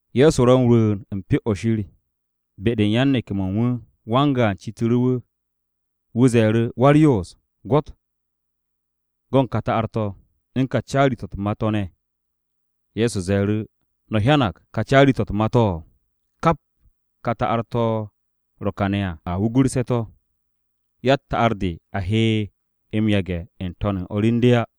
Ye̱so ro m-rwu̱u̱n u̱n Pyo-o̱ Shir, be-de u̱n yan-neke̱-mo̱ u̱n wu̱, wan-gaan citu̱ru̱ wu̱. Wu̱ ze̱e̱ru̱, “Wa-u̱r-Yoos, gwo̱t go̱n ka ta'ar-to̱, u̱n ka caari-to̱ u̱t-ma to̱ ne̱.” Ye̱so ze̱e̱ru̱, “¿No̱ hyanag ka caari-to̱ u̱t-ma to̱? Kap ka ta'ar-to̱ ro̱ kane̱ à, a wugurse̱ to̱. Yatt ta'ar-de a he m-yage̱ n-to̱n u̱n o̱r u̱n de á.”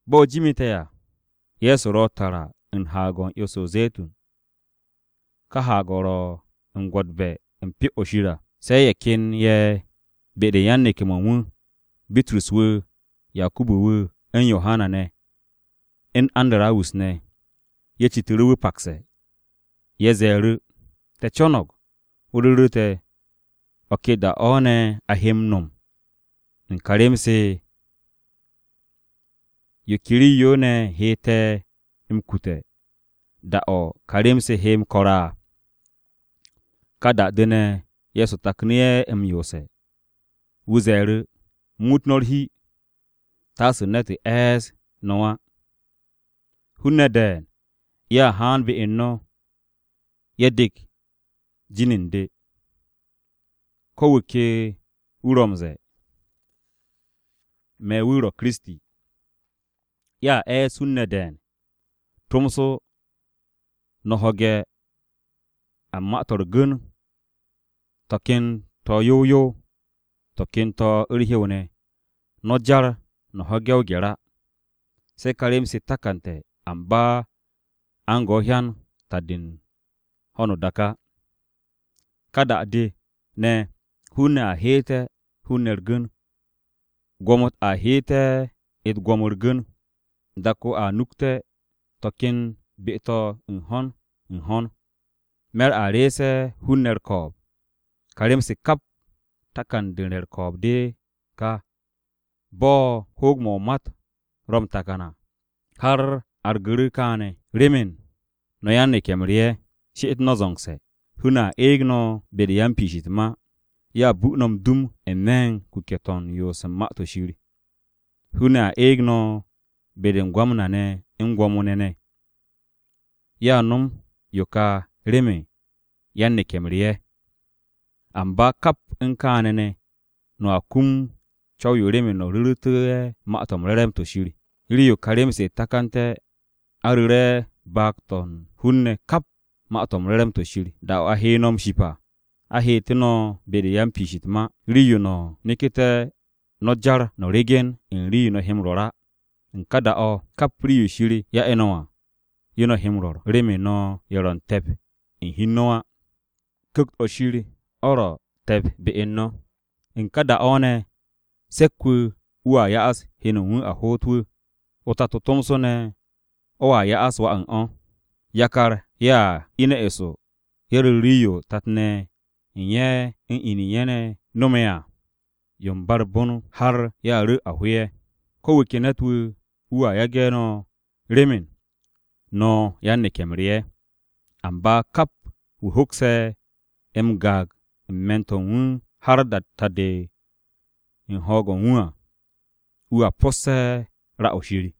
Bo̱ jimite̱ à, Ye̱so ro tara u̱n Haag-o̱ u̱n 'yo-se o-Ze̱tun, ka haag-o̱ ro̱ u̱n gwo̱tbe̱ u̱n Pyo-o̱ Shir à. Se̱ ye̱ ken ye̱ be-de u̱n yan-neke̱-mo̱ u̱n wu̱, (Bitrus wu̱, Yakubu wu̱, u̱n Yohana ne̱, u̱n Andarawus ne̱), ye̱ citu̱ru̱ wu̱ pakse̱. Ye̱ ze̱e̱ru̱, “Te̱ co̱no̱g o ru̱ru̱ te̱ ¿o̱ ke da-o̱ ne̱ a he m-no̱m u̱n se ka rem-se? ¿Yo ke rii-yo ne̱ he te̱ m-kute̱ da-o̱ ka rem-se he m-ko̱r à?” Ka da-de ne̱, Ye̱so taknu̱ ye̱ m-yoose̱. Wu̱ ze̱e̱ru̱, “Muut no̱ u̱t-hi, taasu̱ ne̱t e̱e̱s no̱ á. Hun-ne̱ de̱e̱n ye̱a haan be u̱n no̱, ye̱ dek jin u̱n de. Ko̱ wu̱ ke wu̱ ro̱ m-ze̱e̱ wu̱ ro̱ Kiristi. Ye̱a e̱e̱s hun-ne̱ de̱e̱n. Tomso, no̱ ho̱ge̱ a u̱n ma-to̱ u̱r-gu̱n, to̱ ken to̱ yow yow, to̱ ken to̱ u̱r-hyew ne̱, no̱ jar no̱ ho̱ge̱ o-gye̱r á. Se̱ ka rem-se takante̱, amba a u̱n go hyan ta-de u̱n ho̱no o-dak á. Ka da-de ne̱, hun-ne̱ a heete̱ hun-ne̱ u̱r-gu̱n. Gwo̱mo-u̱t a heete̱ u̱t-gwo̱mo u̱r-gu̱n. Dak-o a nukte̱ to̱ ken be-to̱ u̱n ho̱n u̱n ho̱n. Me̱r a reese̱ hun-ne̱ u̱r-ko̱o̱b. Ka rem-se kap, takan-de u̱n re̱ u̱r-ko̱o̱b de ka, bo̱ hoog-mo̱ o-mat ro̱ m-takan à har argu̱ru̱ kaane̱. “Remen no̱ yan-neke̱-m re ye̱, ‘She'et no̱ zo̱ngse̱!’ Hun-ne̱ a eeg no̱ be-de u̱n yan-piish u̱t-ma. Ye̱a bu no̱ m-dum n-me̱ u̱n kuke̱-to̱ u̱n yoos u̱n Ma-to̱ Shir. Hun-ne̱ a eeg no̱ be-de u̱n gwamna-ne̱ u̱n gwo̱mo-ne̱ ne̱. Ye̱a nom yo kà remen no̱ yan-neke̱-m re ye̱. Amba kap u̱n kaane̱ ne̱, no̱a kum o-co̱w remen no̱ ru̱ru̱tú̱ ye̱ Ma-to̱ m-Re̱re̱m to̱ Shir. Rii-yo ka rem-se takante̱, a ru̱re̱ baag-to̱ u̱n hun-ne̱ kap Ma-to̱ m-Re̱re̱m to̱ Shir. Da-o̱ a he no̱ m-ship à, a heete̱ no̱ be-de u̱n yan-piish u̱t-ma. Rii-yo no̱ neku̱te̱ no̱ jar no̱ ryegen u̱n rii-yo no̱ he m-rwo̱r á. U̱n ka da-o̱, kap rii-yo Shir ya'e̱ no̱ à, yo no̱ he m-rwo̱r remen no̱ ye̱ ro̱ te̱p u̱n hi u̱n no̱ á. Ku̱kt-o̱ Shir o̱ ro̱ te̱p be u̱n no̱. “U̱n ka da-o̱ ne̱, se̱k-wu̱ wu̱a ya'as heno u̱n wu̱ a hoot wu̱. O-tato tomso ne̱ o̱a ya'as wà u̱n o̱. Yakar ye̱a ine̱ eso ye̱ ru̱r rii-yo tat-ne̱ ye̱ u̱n ye̱ u̱n in-ne̱ ye̱ u̱n ye̱ ne̱ no̱me̱ à yo u̱n ba u̱r-bon har ye̱a ru̱ a ho ye̱. Ko̱ wu̱ ke ne̱t-wu̱ wu̱a yage̱ no̱ remen no̱ yan-neke̱-m re ye̱. Amba kap wu̱ hokse̱ m-gaag u̱n me̱n-to̱ u̱n wu̱ har ta-de u̱n ho̱o̱g-o̱ u̱n wu̱ à, wu̱a po̱sse̱ ra-o̱ Shir.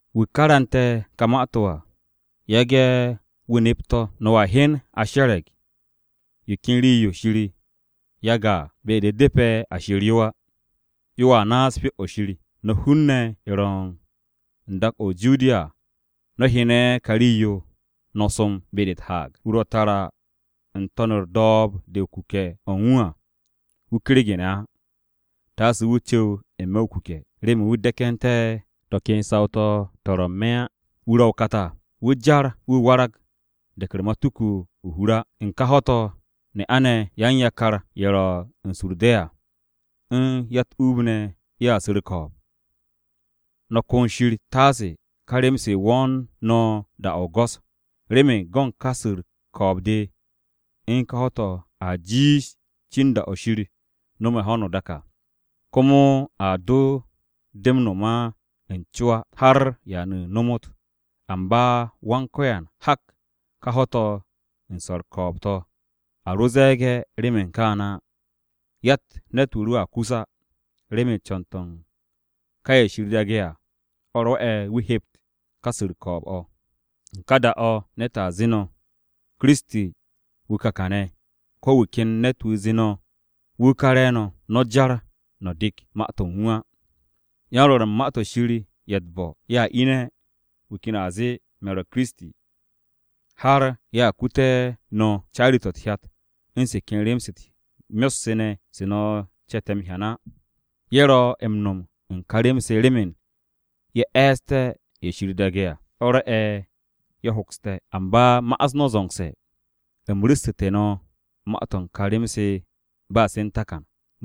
“Wu̱ karu̱nte̱ ka ma-to̱ à, yage̱ wu̱ nep to̱. ‘No̱a hyen a she̱re̱g yo ken rii-yo Shir yage̱ à, be-de u̱depe̱ a sher yo á.’ Yoa naas Pyo-o̱ Shir. No̱ hun-ne̱ ye̱ ro̱ u̱n dak-o̱ o-Judiya à, no̱ hyene̱ ka rii-yo, no̱ som be-de u̱t-haag. Wu̱ ro̱ tara n-to̱n u̱r-do̱o̱b de o-kuke̱ o̱ u̱n wu̱ à, wu̱ kergene̱ á taase wu̱ cu̱w n-me̱ o-kuke̱, remen wu̱ de̱ke̱nté̱ to̱ ken saw-to̱ to̱ ro̱ n-me̱ á. Wu̱ ro̱ o-kat à, wu̱ jar wu̱ warag de̱k u̱r-matuku o-hur á. U̱n ká ho̱-to̱, ne'a-ne̱ yan-yakar-ye̱ ro̱ u̱n su u̱r-de̱ à, u̱n ya-u̱t-uub ne̱ ye̱a su̱ u̱r-ko̱o̱b. No̱ ko̱n Shir taase ka rem-se wo̱o̱n no̱ da-o̱ o-go̱s. Remen go̱n ka su̱ u̱r-ko̱o̱b de, u̱n ká ho̱-to̱ a jiish cin da-o̱ Shir no̱me̱ ho̱no o-dak à. Komo a do de m-no̱m n-co á har da-o̱ ba m-ta. Amba Wan-Ko̱yan hak ka ho̱-to̱ u̱n su̱ u̱r-ko̱o̱b to̱. A ro ze̱e̱ge̱ remen kaane̱ á, yatt ne̱t-wu̱ ro̱a kus á. Remen co̱n-to̱ u̱n ká ye̱ Shir daage̱ à, o̱ rwo̱'e̱ wu̱ hept ka su̱ u̱r-ko̱o̱b o̱. U̱n ka da-o̱, ne̱t zee no̱, ‘Kiristi, wu̱ ka kane̱,’ ko̱ wu̱ ken ne̱t-wu̱ zee no̱, ‘Wu̱ ka re̱e̱no̱,’ no̱ jar no̱ dek ma-to̱ u̱n wu̱ á. Yan-rwo̱r u̱n ma-to̱ Shir ye̱ u̱t-bo̱ ye̱a ine̱, wu̱ ken a zee, ‘Me̱ ro̱ Kiristi,’ har ye̱a kute̱ no̱ caari-to̱ u̱t-hyat u̱n se ken rem-se u̱s-myot se ne̱ se no̱ ce̱te̱ m-hyan á. Ye̱ ro̱ m-no̱m u̱n ka rem-se remen ye̱ e̱e̱ste̱ ye̱ Shir daage̱ à, o̱ rwo'e̱ ye̱ hokste̱. Amba ma'as no̱ zo̱ngse̱. U̱m ru̱ssu̱te̱ no̱ ma-to̱ u̱n ka rem-se ba se̱ u̱n takan.”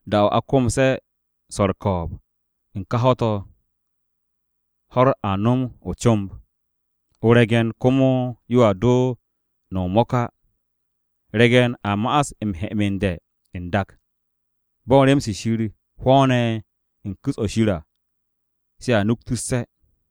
“Da-o̱ a komse̱ swo̱ u̱r-ko̱o̱b, u̱n ká ho̱-to̱, “ ‘ho̱-u̱r a nom o-comb. O-re̱ng komo yoa do no̱m o-mo̱k á. Re̱ge̱n a ma'as m-he'emende̱ n-dak. Bo̱n rem-se Shir hwo̱o̱ne̱ n-ku̱s o̱ Shir à, se à nuktusse̱.’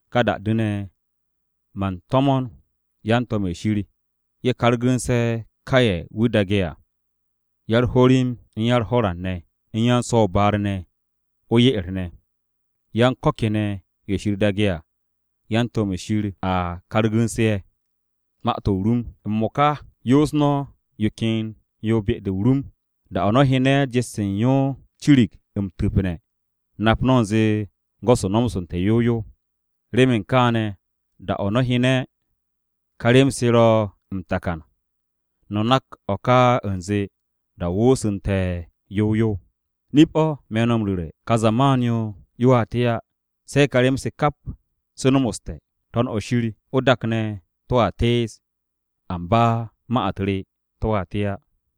Ka da-de ne̱, man to̱mo̱n yan-to̱m-ye̱ Shir, ye̱ kargu̱nse̱ ka ye̱ wu̱ daage̱ à, ya-u̱r-ho̱rim u̱n ya-u̱r-ho̱ran ne̱ u̱n yan-so̱-o-baar ne̱ o-ye'er ne̱, yan ko̱ kene̱ ye̱ Shir daage̱ à, yan-to̱m-ye̱ Shir a kargu̱nse̱ ye̱. “M-mo̱ka, yoos no̱ yo ken yo be-de o-rum. Da-o̱ no̱ hyene̱ jet-se u̱n yo cirig m-tu̱pne̱, nap no̱ u̱nze go̱s-o nomoste̱ yow yow. Remen kaane̱ da-o̱ no̱ hyene̱ kà rem-se ro̱ m-takan, no̱ nak o̱ ka u̱nze da-o woosu̱nte̱ yow yow. Nip-o̱ me̱ no̱ m-ru̱re̱, kà zaman-yo yoa te á se̱ ka rem-se kap se nomoste̱. To̱n-o̱ shir, o-dak ne̱ to̱a tees, amba ma-u̱t re to̱a te á.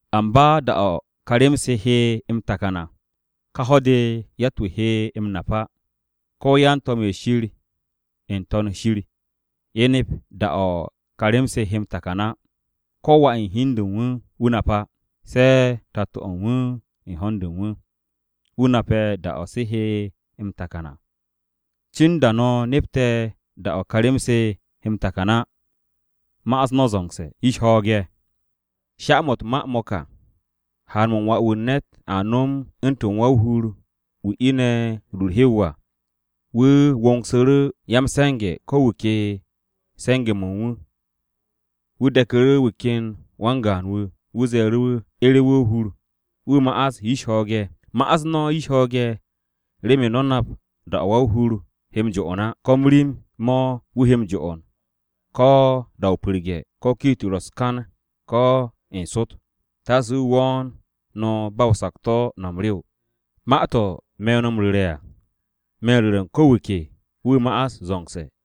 “Amba da-o̱ ka rem-se he m-takan à, ká ho̱-de yatt-wu̱ he m-nap á. Ko̱ yan-to̱m-ye̱ Shir n-To̱n shir, ye̱ nep da-o̱ ka rem-se he m-takan á. Ko̱ Wà u̱n hi u̱n de u̱n wu̱, wu̱ nap á. Se̱ o-Tato u̱n wu̱ u̱n ho̱n-de u̱n wu̱. Wu̱ nape̱ da-o̱ se he m-takan à. Cin da no̱ nepte̱ da-o̱ ka rem-se he m-takan á, ma'as no̱ zo̱ngse̱, yish ho̱o̱ge̱! Sha-mo̱ u̱t-ma mo̱ ka. Haan-mo̱ u̱n Wà-wu̱ u̱n ne̱t, a nom u̱ntu̱n wa-o-hur wu̱ ine̱ rur u̱r-hyew à. Wu̱ wongsu̱ru̱ ya-m-se̱nge̱, ko wu̱ ke u̱n se̱nge̱-mo̱ u̱n wu̱ ne̱. Wu̱ de̱ku̱ru̱ wu̱ ken wan-gaan wu̱, wu̱ ze̱e̱ru̱ wu̱ ere̱ wu̱ o-hur, wu̱ ma'as yish ho̱o̱ge̱. “Ma'as no̱ yish ho̱o̱ge̱ remen no̱ nap da-o̱ wa-o-hur he m-jo'on á. ¿Ko̱ m-rim mo̱ wu̱ he m-jo'on, ko̱ da-o pu̱rge̱, ko̱ kiit ro̱ u̱s-kan, ko̱ n-sot? Taase wu̱ wo̱o̱n no̱ ba o-sakto̱, no̱ m-rew. Ma-to̱ me̱ no̱ m-ru̱re̱ à, me̱ u̱n ru̱re̱ ko̱ wu̱ ke, wu̱ ma'as zo̱ngse̱.”